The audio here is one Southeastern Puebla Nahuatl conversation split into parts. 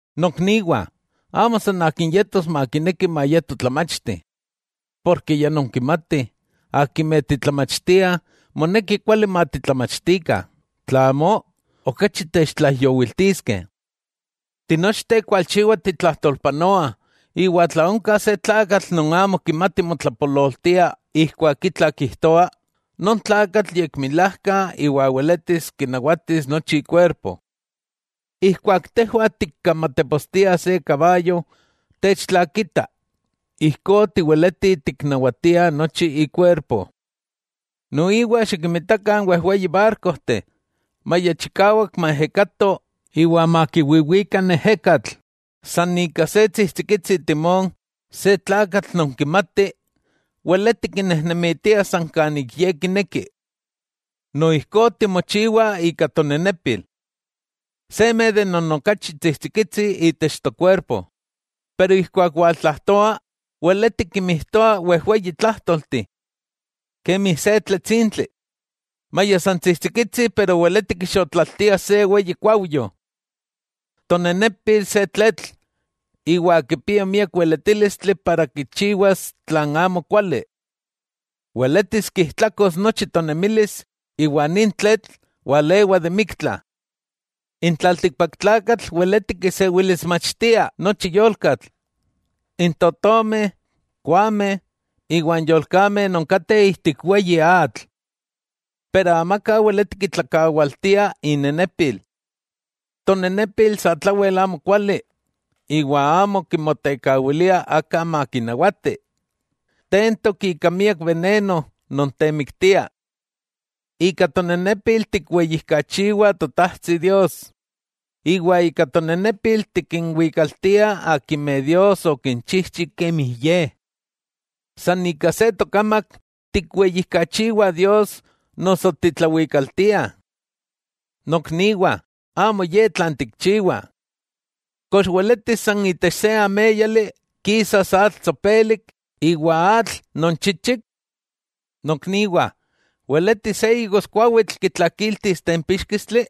Nokniwah, amo san akin yetos makineki mayeto tlamachti, porke ya nonkimatih, akimeh titlamachtiah moneki kuali matitlamachtikah tla amó, okachi techtlaijyowiltiskeh. Tinochteh kualchiwa titlajtolpanoah, iwa tla onka se tlakatl non amo kimati motlapololtia ijkuak itla kijtoa, non tlakatl yekmilajka iwa weletis kinawatis nochi ikuerpo. Ijkuak tejwah tikkamatepostiah se kabayo techtlakita, ijkó tiweletih tiknawatia nochi ikuerpo. Noiwa xikinmitakah n wejweyi barkojteh, maya chikawak maejekato iwa makiwiwika n ejekatl, san ika se tsijtsikitsi timón se tlakatl non kimati weleti kinnejnemitia san kan ik ye kineki. Noijkó timochiwa ika tonenepil. Ye non okachi tsijtsikitsi itech tokuerpo, pero ijkuak waltlajtoa, weleti kinmijtoa wejweyi tlajtolteh. Kemi se tletsintli, ¡maya san tsijtsikitsi pero weleti kixotlaltia se weyi kuaujyo! Tonenepil se tletl, iwa kipia miak weletílistli para kichiwas tlan amokuali. Weletis kijtlakos nochi tonemilis, iwa nin tletl walewa de miktla. N tlaltikpaktlakatl weleti kisewilismachtia nochi yolkatl, n totomeh, koameh, iwa n yolkameh non kateh ijtik weyi atl. Pero amaka weleti kitlakawaltia inenepil. Tonenepil satlawel amokuali iwa amo kimotekawilia aka makinawati, tentok ika miak beneno non temiktia. Ika tonenepil tikweyijkachiwah Totajtsi Dios, iwa ika tonenepil tikinwikaltiah akimeh Dios okinchijchi kemi Ye. San ika se tokamak tikweyijkachiwah Dios noso titlawikaltia. Nokniwah, amo ye tlan tikchiwah. ¿Kox weletis san itech se améyali kisas atl tsopelik iwa atl non chichik? Nokniwah, ¿weletis se igoskuawitl kitlakiltis tempíxkistli?,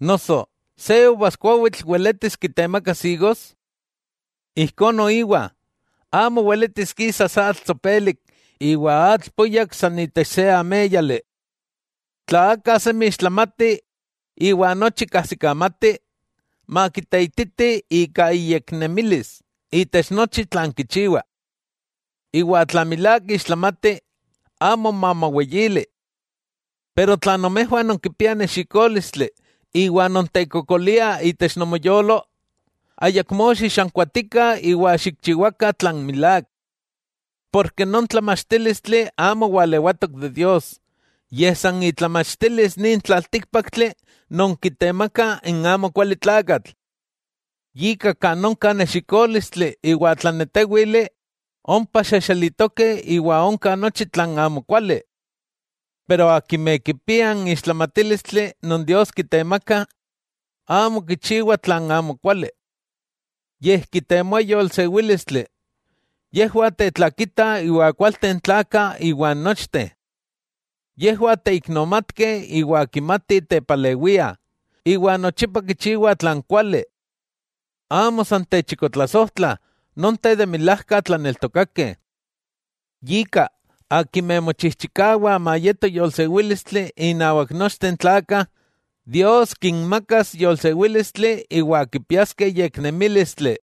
noso ¿se uvaskuawitl weletis kitemakas igos? Ijkó noiwa, amo weletis kisas atl tsopelik iwa atl puyak san itech se améyali. Tla aka semi ixtlamati iwa nochi kajsikamati, makiteititi ika iyeknemilis itech nochi tlan kichiwa. Iwa tla milák ixtlamati, amo mamoweyili. Tla nomejwah nonkipiah nexikólistli iwa nontekokoliah itech nomoyolo, ayakmó xixankuatikah iwa xikchiwakah tlan milák. Porke non tlamachtílistli amo walewatok itech Dios, yej san itlamachtilis nin tlaltíkpaktli non kitemaka n amokualitlakatl. Yika kan onka nexikólistli iwa tlanetéwili, ompa xejxelitokeh iwa onka nochi tlan amokuali. Pero akimeh kipiah n ixtlamatílistli non Dios kitemaka, amo kichiwah tlan amokuali, yej kitemoah yolsewílistli, yejwah tetlakitah iwa kualteh n tlakah iwan nochteh. Yejwah teiknomatkeh iwa kimatih tepalewiah, iwa nochipa kichiwah tlan kuali. Amo san techikotlasojtlah, nonteh de milajka tlaneltokakeh. Yika, akimeh mochijchikawah mayeto yolsewílistli innawak nochteh n tlakah, Dios kinmakas yolsewílistli iwa kipiaskeh yeknemílistli.